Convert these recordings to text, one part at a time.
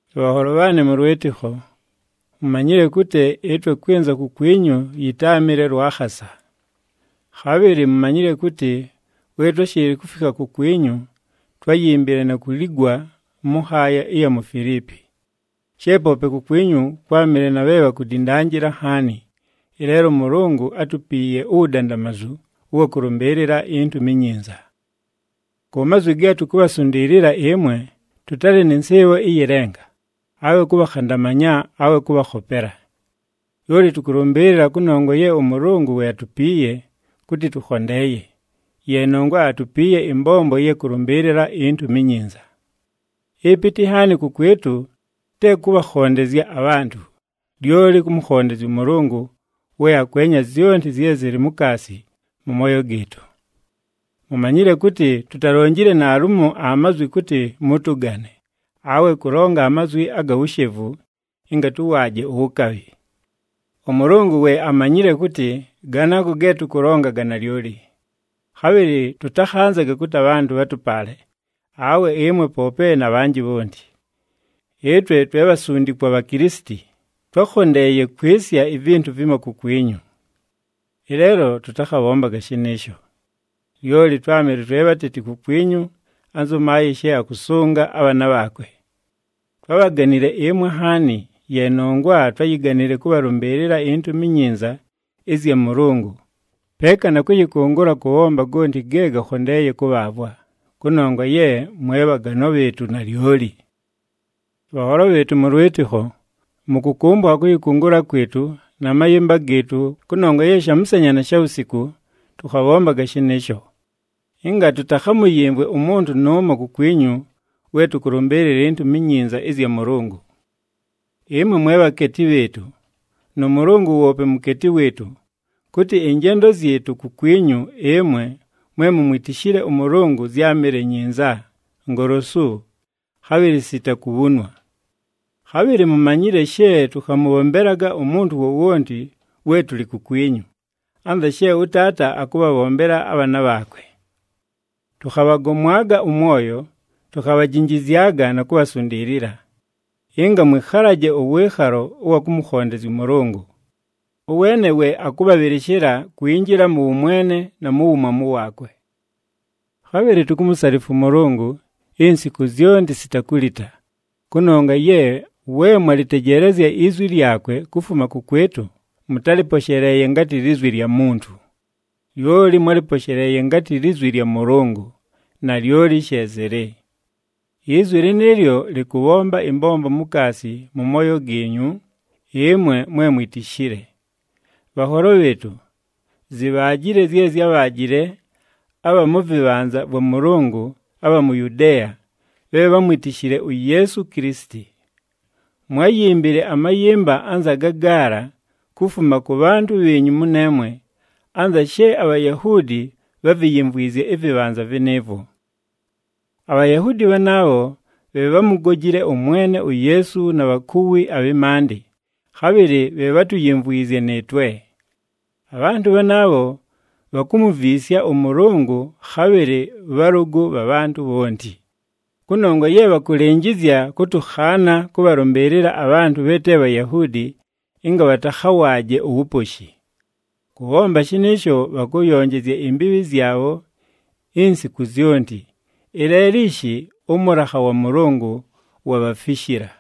Bhanholo bhaanɨ mʉ lwɨtɨkho, mumanyile kʉtɨ ɨtwe kwɨnza kukwinyu yɨtáamɨle lwa khasa. Khabhɨlɨ mumanyile kʉtɨ we twáshɨɨlɨ kufikha kukwinyu, twáyimbile na kuligwa mʉ nhaaya ɨya mu Filiipi. She poope kukwinyu kwámɨle na bhe bhakudindanjila nhaani, ɨleelo ʉMʉlʉngʉ átupiiye uwudandamazu ʉwa kʉlʉmbɨɨlɨla iNtumi iNyinza. Ku mazwi ge tukubhasundiilila ɨmwe tʉtalɨ nɨ nsɨɨbho ɨyɨ lenga, awe kʉbhakhandamanya awe kʉbhakhopela. Lyoli tʉkʉlʉmbɨɨlɨla kʉnongwa ye ʉMʉlʉngʉ we atupiiye kʉtɨ tʉkhondeeye, ye nongwa atupiiye ɨmbombo ɨya kʉlʉmbɨɨlɨla iNtumi iNyinza. Ɨpɨtɨ nhaani kʉkwɨtʉ te kʉbhakhondezya abhantʉ, lyoli kʉmʉkhondezya ʉMʉlʉngʉ we akwenya zyonti zye zɨlɨ mukaasi mʉ mooyo gɨɨtʉ. Mumanyile kʉtɨ tutalonjile naalumo amazwi kʉtɨ mʉtʉgane, awe kʉlonga amazwi aga wushevu ɨnga tʉwaaje uwukabhi. ɄMʉlʉngʉ we amanyile kʉtɨ ganaago ge tʉkʉlonga ga nalyoli. Khabhɨlɨ tʉtakhanzaga kʉtɨ abhantʉ bhatʉpaale, awe ɨmwe poope na bhanjɨ bhonti. Ɨtwe twe bhasundikwa bha Kilisiti, twákhondeeye kwɨsya ivintu vimo kukwinyu. Ɨleelo tʉtakhabhombaga shɨnɨɨsho. Lyoli twámɨle twe bhateti kukwinyu anzʉ maayɨ she akʉsʉnga abhaana bhaakwe. Twábhaganile ɨmwe nhaani, ye nongwa twáyiganile kʉbhalʉmbɨɨlɨla iNtumi iNyinza ɨzya Mʉlʉngʉ, peeka na kʉyɨkʉngʉla kʉbhomba gonti ge gakhondeeye kʉbhaavwa, kʉnongwa ye mwe bhaganwa bhɨɨtʉ nalyoli. Bhanholo bhɨɨtʉ mʉ lwɨtɨkho, mʉkʉkʉmbʉkha kʉyɨkʉngʉla kwɨtʉ na mayɨmba gɨɨtʉ kʉnongwa ye shamʉsanya na shawusiku, tʉkhabhombaga shɨnɨɨsho, ɨnga tʉtakhamʉyɨmvwe umuntu nʉʉmo kukwinyu we tʉkʉlʉmbɨɨlɨla iNtumi iNyinza ɨzya Mʉlʉngʉ. Ɨmwe mwe bhakeeti bhɨɨtʉ nʉ Mʉlʉngʉ woope mukeeti wɨɨtʉ kʉtɨ ɨnjendo zyɨtʉ kukwinyu ɨmwe mwe mumwitishile ʉMʉlʉngʉ zyámɨle nyinza, ngolosu, khabhɨlɨ sita kubhunwa. Khabhɨlɨ mumanyile she tʉkhamʉbhombelaga umuntu wowonti we tʉlɨ kukwinyu, anza she ʉtaata akʉbhabhombela abhaana bhaakwe. Tʉkhabhagomwaga ʉmwoyo, tukhabhajinjizyaga na kubhasundiilila, ɨnga mwɨkhalaje ʉwɨɨkhalo ʉwa kʉmʉkhondezya ʉMʉlʉngʉ. Ʉweene we akʉbhabhɨlɨshɨla kwinjila mʉ wʉmwene na mu wumwamu waakwe. Khabhɨlɨ tukumusalifwa ʉMʉlʉngʉ insiku zyonti sita kulita, kʉnongwa ye we mwalɨtejeelezya izwi lyakwe kufuma kʉkwɨtʉ, mʉtálɨposheleeye ngatɨ lizwi lya muntu. Lyoli mwálɨposheleeye ngatɨ lizwi lya Mʉlʉngʉ, nalyoli she zɨlɨ. Izwi lɨnɨɨlyo lɨkʉbhomba ɨmbombo mukaasi mʉ mooyo giinyu ɨmwe mwe mwitishile. Bhanholo bhɨɨtʉ, zibhaajile zye zyábhaajile abha mʉ vɨbhanza vwa Mʉlʉngʉ abha mu Yudeeya, bhe bhámwitishile uYeesu Kilisiti. Mwáyimbile amayɨmba anza gagaala kufuma kʉ bhantʉ bhiinyu mʉneemwe anza she aBhayahuudi bhaviyimvwizye ɨvɨbhanza vɨnɨɨvwo. ABhayahuudi bhanaabho bhe bhámugojile ʉMwene uYeesu na bhakuwi abhɨ maandɨ, khabhɨlɨ bhe bhátuyimvwizye nɨɨtwe. Abhantʉ bhanaabho bhakumuviisya ʉMʉlʉngʉ khabhɨlɨ bhalʉgʉ bha bhantʉ bhonti, kʉnongwa ye bhakʉlɨnjɨzya kʉtʉkhaana kʉbhalʉmbɨɨlɨla abhantʉ bhe te Bhayahuudi ɨnga bhatakhawaaje uwuposhi. Kʉbhomba shɨnɨɨsho bhakʉyonjezya imbiibhi zyabho insiku zyonti. Ɨleelo ishi ʉmʉlakha wa Mʉlʉngʉ wabhafishila!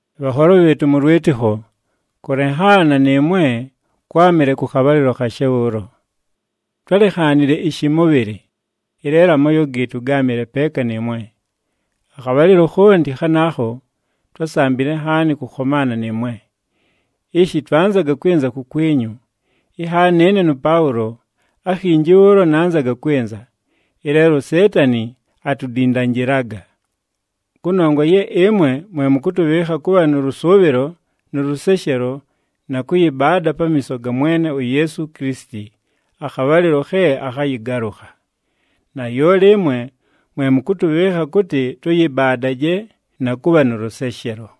Bhanholo bhɨɨtʉ mʉ lwɨtɨkho, kʉlenhaana nɨɨmwe kwámɨle kʉ khabhalɨlo khashe bhʉʉlo. Twálenhaanile ɨshɨmʉbhɨlɨ, ɨleelo amooyo gɨɨtʉ gáamɨle peeka nɨɨmwe. Akhabhalɨlo khonti khanaakho twásambile nhaani kʉkhomaana nɨɨmwe. Ishi twanzaga kwɨnza kukwinyu, inhaani ɨne nʉPaʉlo akhinji bhʉʉlo nanzaga kwɨnza, ɨleelo uSeetani atudindanjilaga. Kʉnongwa ye ɨmwe mwe mʉkʉtʉbhɨɨkha kʉbha nʉ lʉsʉʉbhɨlo, nʉ lʉseshelo, na kʉyɨbaada pamiiso ga Mwene uYeesu Kilisiti akhabhalɨlo khe akhayɨgalʉkha. Nalyoli ɨmwe mwe mʉkʉtʉbhɨɨkha kʉtɨ tʉyɨbaadaje na kʉbha nʉ lʉseshelo.